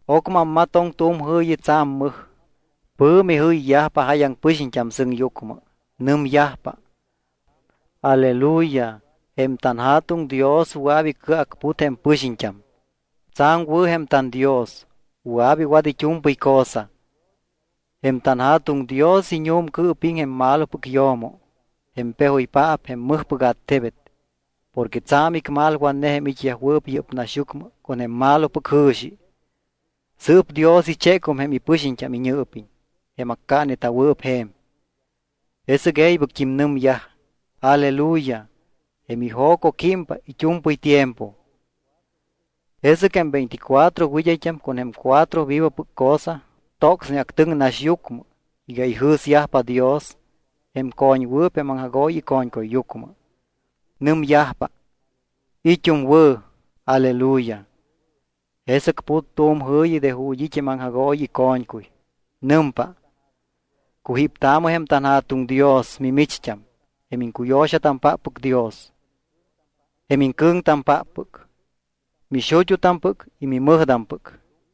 Ocmɨ ammatoŋ tu̱m jɨ̱yi tsa̱m mɨj. Pɨ̱mi jɨyyajpa jáyaŋ pɨxiñt́am sɨŋyucmɨ. Nɨmyajpa: ¡Aleluya! Jém tanJa̱tuŋ Dios wɨa̱p icɨacput jém pɨxiñt́am. Tsa̱m wɨ̱ jém tanDios, wɨa̱p iwat it́u̱mpɨy cosa. Jém tanJa̱tuŋ Dios iñu̱mcɨɨpiŋ jém malopɨc yo̱mo, jém pejoypaap jém mɨjpɨc attebet, porque tsa̱m icmalwatne jém it́yajwɨɨp yɨ́p naxyucmɨ con jém malopɨc jɨ̱xi. Sɨɨp Dios ichécum jém ipɨxiñt́am iñɨɨpiñ, jém accaata̱wɨɨp je̱m. Jesɨc e̱ybɨct́im nɨmyaj: —¡Aleluya! Jém ijo̱co químpa it́u̱mpɨy tiempo. Jesɨc jém veinticuatro wɨd́ayt́am con jém cuatro vivopɨc cosa tocsne actɨŋ naxyucmɨ iga ijɨ̱syajpa Dios jém co̱ñwɨɨp jém aŋjagooyi ico̱ñcuyyucmɨ. Nɨmyajpa: —¡It́um wɨ̱! ¡Aleluya! Jesɨc put tu̱m jɨ̱yi de ju̱t́ it́ jém aŋjagooyi ico̱ñcuy. Nɨmpa: Cujíptaamɨ jém tanJa̱tuŋ Dios, mimicht́am, jém iŋcuyo̱xatampáppɨc Dios, jém iŋcɨ̱ŋtampáppɨc, mixut́utampɨc y mimɨjtampɨc.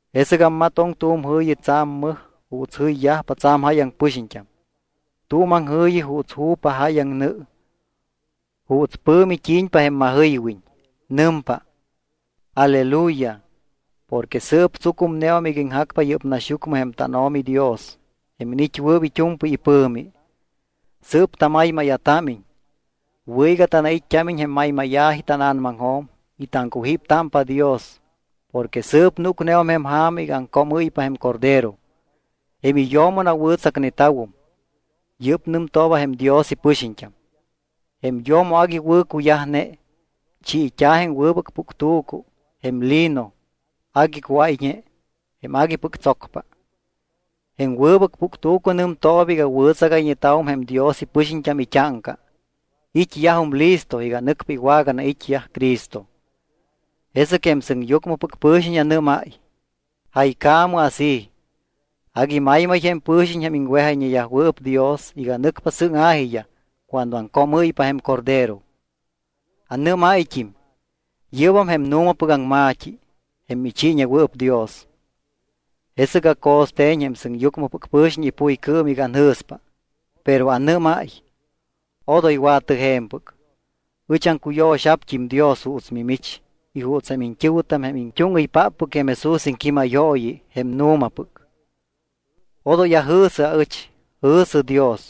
Jesɨc ammatoŋ tu̱m jɨ̱yi tsa̱m mɨj juuts jɨyyajpa tsa̱m jáyaŋ pɨxiñt́am, tu̱m aŋjɨ̱yi juuts ju̱pa jáyaŋ nɨ, juuts pɨ̱mi t́i̱ñpa jém majɨywiñ. Nɨmpa: ¡Aleluya! Porque sɨɨp tsucumneum iga iŋjacpa yɨ́p naxyucmɨ jém tanO̱mi Dios jém iniit́wɨɨp it́u̱mpɨy ipɨ̱mi. Sɨɨp tamaymáya̱támiñ. Wɨ̱ iga tanait́t́ámiñ jém maymáya̱ji tána̱namaŋjo̱m y taŋcujíptámpa Dios porque sɨɨp núcneum jém ja̱ma iga aŋcoomɨ́ypa jém Cordero. Jém iyo̱mo nawɨ̱tsacneta̱wom. (Yɨ́p nɨmtooba jém Dios ipɨxiñt́am.) Jém yo̱mo agui wɨ̱cuyajne. Chiit́a̱ jém wɨbɨc puctu̱cu, jém lino agui cuáyñe, jém aguipɨc tsocpa. Jém wɨbɨc puctu̱cu nɨmtooba iga wɨ̱tsagayñeta̱wum jém Dios ipɨxiñt́am it́áŋca. It́yajum listo iga nɨcpa iwaganait́yaj Cristo. Jesɨc jém sɨŋyucmɨpɨc pɨ̱xiñ anɨ́máy: —Jaycaamɨ así: “Agui maymay jém pɨ̱xiñ jém iŋwejayñeyajwɨɨp Dios iga nɨcpa sɨ́ŋa̱jiyaj cuando aŋcoomɨ́ypa jém Cordero.” Anɨ́máyt́im: —Yɨ́bam jém nu̱mapɨc aŋma̱t́i, jém michiiñewɨɨp Dios. Jesɨc aco̱ste̱ñ jém sɨŋyucmɨpɨc pɨ̱xiñ ipuycɨɨm iga anjɨ̱spa. Pero anɨ́máy: —Odoy wa̱tɨ je̱mpɨc. Ɨch aŋcuyo̱xa̱pt́im Dios juuts mimich y juuts jém iñt́ɨ̱wɨtam jém it́úŋɨypáppɨc jém Jesús iŋquímayooyi, jém nu̱mapɨc. Odoy ajɨ̱sɨ aɨch, jɨ̱sɨ Dios.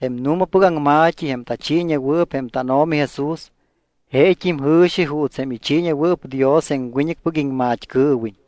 Jém nu̱mapɨc aŋma̱t́i, jém tachiiñewɨɨp jém tánO̱mi Jesús, jeet́im jɨ̱xi juuts jém ichiiñewɨɨp Dios jém wiñɨcpɨc iŋmat́cɨɨwiñ.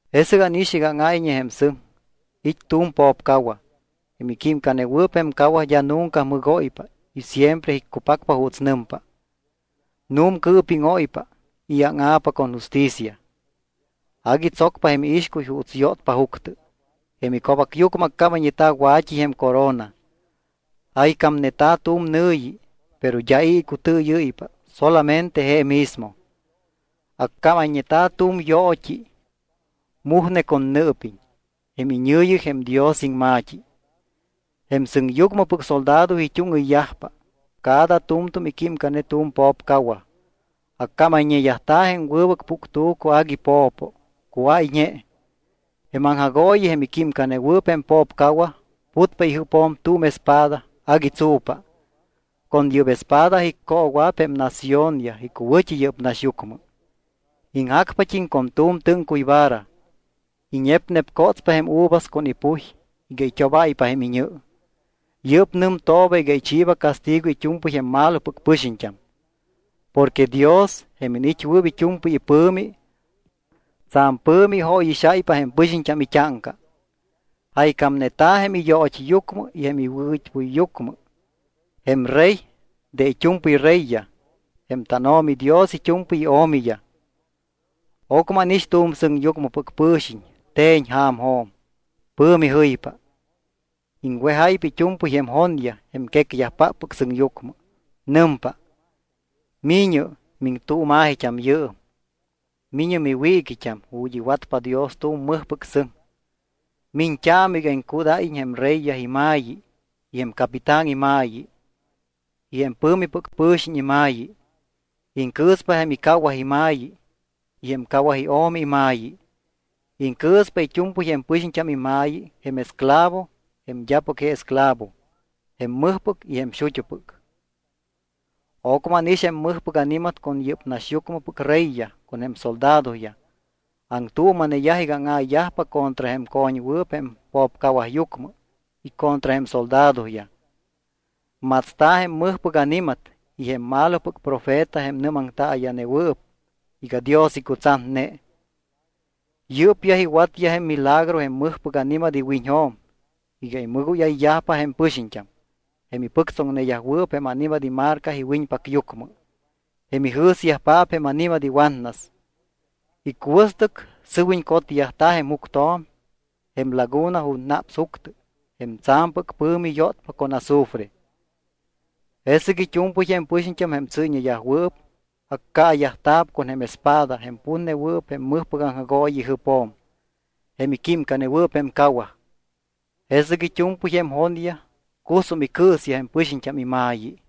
Jesɨc ánix iga áŋáyñe jém sɨŋ. It́ tu̱m po̱pcawaj. Jém iquímcanewɨɨp jém cawaj d́a nunca mɨgóypa y siempre iccupacpa juuts nɨmpa. Nu̱mcɨɨpíŋóypa y áŋa̱pa con justicia. Agui tsocpa jém iixcuy juuts yótpa juctɨ. Jém ico̱bacyucmɨ accámayñeta̱ wa̱t́i jém corona. Jaycámneta̱ tu̱m nɨ̱yi, pero d́a i̱ icutɨɨyɨ́ypa solamente je mismo. Accámayñeta̱ tu̱m yoot́i mujne con nɨɨpiñ. Jém iñɨ̱yi jém Dios Iŋma̱t́i. Jém sɨŋyucmɨpɨc soldado it́úŋɨyyajpa. Cada tu̱mtu̱m iquímcane tu̱m po̱pcawaj. Accámayñeyajta̱ jém wɨbɨc puctu̱cu agui po̱po, cuáyñe. Jém aŋjagooyi jém iquímcanewɨɨp jém po̱pcawaj putpa ijɨpjo̱m tu̱m espada agui tsu̱pa. Con yɨ́p espada iccoowa̱p jém naciónyaj icuwɨ̱t́i yɨ́p naxyucmɨ. Iŋjacpat́im con tu̱m tɨ́ŋcuy vara. Iñepnepcotspa jém uvas con ipuy iga it́obáypa jém iñɨ. Yɨ́p nɨmtooba iga ichiiba castigo it́u̱mpɨy jém malopɨc pɨxiñt́am. Porque Dios, jém iniit́wɨɨp it́u̱mpɨy ipɨ̱mi, tsa̱m pɨ̱mi ijóyixáypa jém pɨxiñt́am it́áŋca. Jaycámneta̱ jém iyoot́yucmɨ y jém iwɨt́puyyucmɨ: “Jém Rey de it́u̱mpɨy reyyaj, jém tánO̱mi Dios it́u̱mpɨy io̱miyaj.” Ocmɨ ánix tu̱m sɨŋyucmɨpɨc pɨ̱xiñ te̱ñ ja̱mjo̱m. Pɨ̱mi jɨypa. Iŋwejáypa it́u̱mpɨy jém jonyaj jém quecyajpáppɨc sɨŋyucmɨ. Nɨmpa: —Mi̱ñɨ miŋtuuma̱jit́am yɨɨm. Mi̱ñɨ miwiiquit́am ju̱t́ iwatpa Dios tu̱m mɨjpɨc sɨŋ. Miñt́aamɨ iga iŋcudáyiñ jém reyyaj ima̱yi y jém capitán ima̱yi, y jém pɨ̱mipɨc pɨ̱xiñ ima̱yi. Iŋcɨɨspa jém icawaj ima̱yi y jém cawaj io̱mi ima̱yi. Iŋcɨɨspa it́u̱mpɨy jém pɨxiñt́am ima̱yi jém esclavo jém d́apɨc je esclavo jém mɨjpɨc y jém xut́upɨc. Ocmɨ ánix jém mɨjpɨc ani̱mat con yɨ́p naxyucmɨpɨc reyyaj con jém soldadoyaj, aŋtuuma̱neyaj iga áŋa̱yajpa contra jém co̱ñwɨɨp jém po̱pcawajyucmɨ y contra jém soldadoyaj. Matsta̱ jém mɨjpɨc ani̱mat y jém malopɨc profeta jém nɨ́maŋtaaya̱newɨɨp iga Dios icutsatne. Yɨ́pyaj iwatyaj jém milagro jém mɨjpɨc ani̱mat iwiñjo̱m iga imɨgóyayyajpa jém pɨxiñt́am, jém ipɨctsóŋayñeyajwɨɨp jém ani̱mat imarca iwiñpacyucmɨ, jém ijɨ̱syajpaap jém ani̱mat iwatnas. Icuɨstɨc sɨwiñ cotyajta̱ jém juctjo̱m jém laguna ju̱t́ naps juctɨ jém tsa̱mpɨc pɨ̱mi yótpa con azufre. Jesɨc it́u̱mpɨy jém pɨxiñt́am jém tsɨ́yñeyajwɨɨp, accaayajta̱p con jém espada jém putnewɨɨp jém mɨjpɨc aŋjagooyi ijɨpjo̱m, jém iquímcanewɨɨp jém cawaj. Jesɨc it́u̱mpɨy jém jonyaj cusum icɨɨsyaj jém pɨxiñt́am ima̱yi.